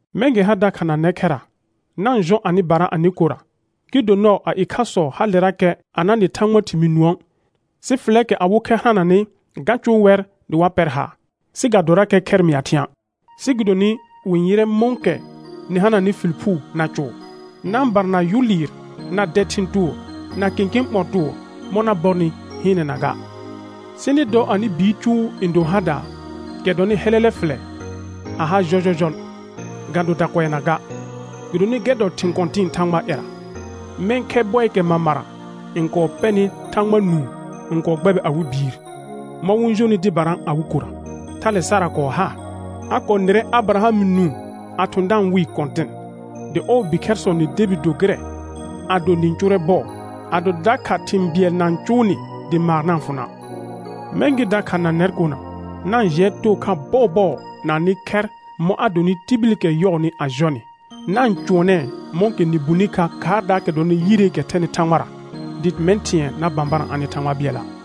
Mɛ̃ gɩ ha dakha na nɛr khɛra, na-n jɔ anɩbara anɩ kora, gɩ do nɔɔ a ɩkhasɔ halerakɛ a na nɩ Thãgbaa thɩmɩɩ nũə', sɩ fɩlɛɛkɛ awɩ khɛr hananɩ ga cʋʋ wɛr dɩ wa pɛr haar, sɩ ga dorakɛ khɛr mɩa thɩ̃a'; sɩ gɩdonɩ wɩ-n yɩrɛ mɔ̃kɛ nɩ hananɩ fɩl phuu na cʋʋr. Na-n barana yʋ lɩɩr, na dɛ thɩ̃ tʋʋr, na kẽkẽ ɓɔ̃ tʋʋr mɔ̃ na bɔrnɩ hɩɩnɛna ga, sɩ nɩ dɔ anɩ biir cʋʋ n do hadaa, kɛ dɔnɩ hɛlɛlɛ fɩlɛ, a ha jɔjɔjɔl ga do dakʋɛnaa ga, gɩdonɩ gɛr dɔ thɩ̃ kɔ̃tɩ̃ɩ Thãgbaa ƴɛra. Mɛ̃ khɛ bɔɩɩkɛ mamara n kɔɔ pɛnɩ Thãgba nũu n kɔɔ gbɛbɩ awɩ biir, mɔ̃ wɩ-n jonɩ dɩbara awɩ kora. Thale Sara kɔɔ ha. A kɔɔ nɩrɛ Abɩraham nũu a thʋ̃ da-n wɩɩ kɔ̃tɩn, dɩ ɔɔ bikhɛrsɔ nɩ debi do gɩrɛ ado nɩ-n cʋʋrɛ bɔɔ, ado dakha thɩ̃ bɩɛl na-n cʋʋ nɩ dɩ maar na-n fʋ na'. Mɛ̃ gɩ dakha na nɛr kona, na-n jɩɛ too kha bɔɔbɔɔ na anɩ khɛr mɔ̃ a donɩ tibilikɛ yɔɔnɩ a jɔ nɩ, na-n cʋɔnɛɛ mɔ̃kɛ nɩ bulni kha khaardaakɛ dɔnɩ yireekɛ thɛnɩ Thãgbara, dɩ mɛ̃ thɩ̃ɛ na bãbarã anɩ Thãgba bɩɛla'.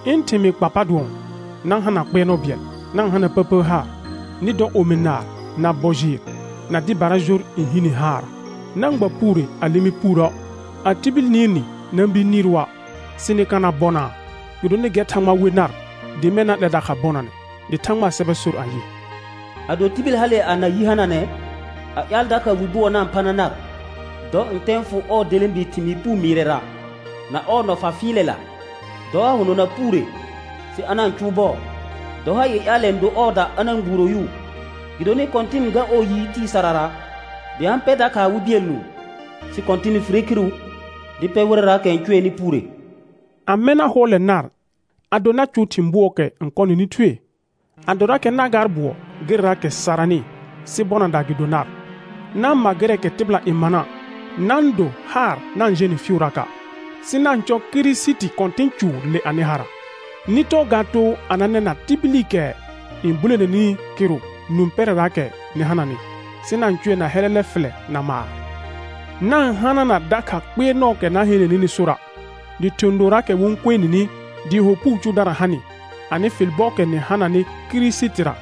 Ɩ̃ thɩmɩɩ kpa pa dʋɔn: Na-n hana kpɩɛrnɔ bɩɛl, na-n hana pəpər haar, nɩ dɔ omi naar, na bɔ jɩɩr, na dɩbara jor n hi ni haarra. Na-n gba puure a lɩmɩ puurə'; a tibil nɩɩr nɩ na-n bir nɩɩrʋa', sɩ nɩ ka na bɔnaa, gɩdonɩ gɛr Thãgba we nar dɩ mɛ̃ na 'lɛ dakha bɔnanɛ. Dɩ Thãgbaa sɛbɛ sor ayɩ: «Ado tibil hale a na yi hananɛ, a ƴaal dakha wi bʋɔ na-n phana nar, dɔ ntɛ n fʋ ɔɔ delẽbi thɩmɩɩ puu mɩɩrɛra, na ɔɔ nɔfa fɩɩlɛla. Dɔ a hʋnɔna puure, sɩ a na-n cʋʋ bɔɔ. Dɔ ha ii ƴaalɛ n do ɔɔda a na-n gbuuro yʋʋ. Gɩdonɩ Kɔ̃tɩn n gar ɔɔ yi tɩɩ sarara, dɩ a-n pɛr dakha awɩ bɩɛl nũu, sɩ Kɔ̃tɩn n fire khiru di pɛ wɩrɛraakɛ n cʋɛnɩ puure.» Amɛ na hʋɔlɛ nar ado na cʋʋ thɩ̃ bʋɔɔkɛ n kɔ nɩnɩ thue? Adorakɛ na gaar bʋɔ gɩrɛraakɛ saranɩ, sɩ bɔnadaa gɩ do nar. Na-n ma gɩrɛɛkɛ tɩbɩla n mana'; na-n do haar na-n jẽ nɩ fɩɩʋraka'. Sɩ na-n cɔ Kirisiti Kɔ̃tɩ̃ cʋʋr le anɩ hara. Nɩ tɔɔ ga too a na nɛna tibilikɛ n bulene nini kɩrʋ nũ pɛrɛraakɛra nɩ hananɩ, sɩ na-n cʋɛ na hɛlɛlɛ fɩlɛ na maar. Na-n hanana dakha kpɩɛrnɔɔkɛ na heene nɩnɩ sora', dɩ thɩ̃ dooraakɛ wɩ-n kue nini dɩɩ ho puu cʋʋdara ha nɩ, anɩ fɩl bɔɔkɛ nɩ hananɩ Kirisitira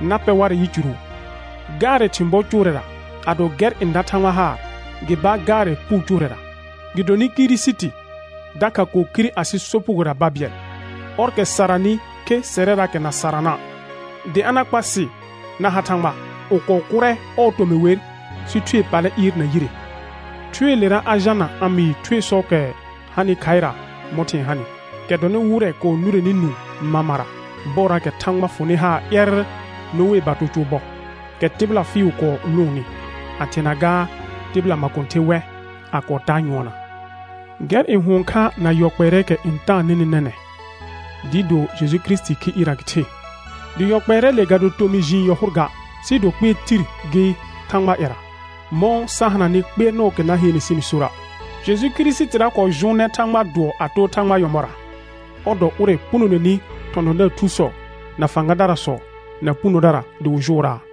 na pɛ warɛ yicuru. Gaarɛ thɩ̃ bɔ cʋʋrɛra, ado gɛr n da Thãgba haar, gɩ baar gaarɛ puu cʋʋrɛra. Gɩdonɩ Kirisiti dakha kɔɔ khire asɩ sopugora babɩɛl, ɔrkɛ saranɩ khe sɛrɛraakɛ na sarana', dɩ a na kpa sɩ na ha Thãgba. Wɩ kɔɔ kʋrɛ ɔɔ tomɩ wer, sɩ Thue pallɛ ɩɩr na yire. Thueelera a jalna a mɩɩ thuesɔɔkɛ hanɩ khaɩra mɔ̃ thɩ̃ɛ hanɩ, kɛ dɔnɩ wɩrɛ kɔɔ nʋrɛnɩ nũu mamara bɔɔraakɛ Thãgba fʋnɩ haar ƴɛrr Noee bato cʋʋ bɔ, kɛ tɩbɩla fɩɩʋ kɔɔ lʋʋnnɩ, a thɩɛna gaa tɩbɩla makõther wɛ, a kɔɔ taa nyʋɔnna. Gɛr n hʋɔn kha na yɔ kpɛɛrɛɛkɛ n taa nɩnɩ nɛnɛ̃, dɩɩ do Jeju Kirisitii khi ɩɩrra gɩ the, dɩ yɔ kpɛɛrɛɛle ga do tomɩ jiin yɔ hʋr ga, sɩɩ do kpɩɛr tir gɩ Thãgbaa ƴɛra, mɔ̃ sa hananɩ kpɩɛrnɔɔkɛ na heene sɩnɩ sora'. Jeju Kirisitira kɔɔ jʋʋnɛ Thãgbaa dʋɔ a too Thãgbaa nyɔ̃bɔra, ɔr dɔ ʋrɛ punoneni thɔ̃thɔ̃daar thusɔ, na fãgadarasɔ, na punodara dɩ wɩ jʋʋraa.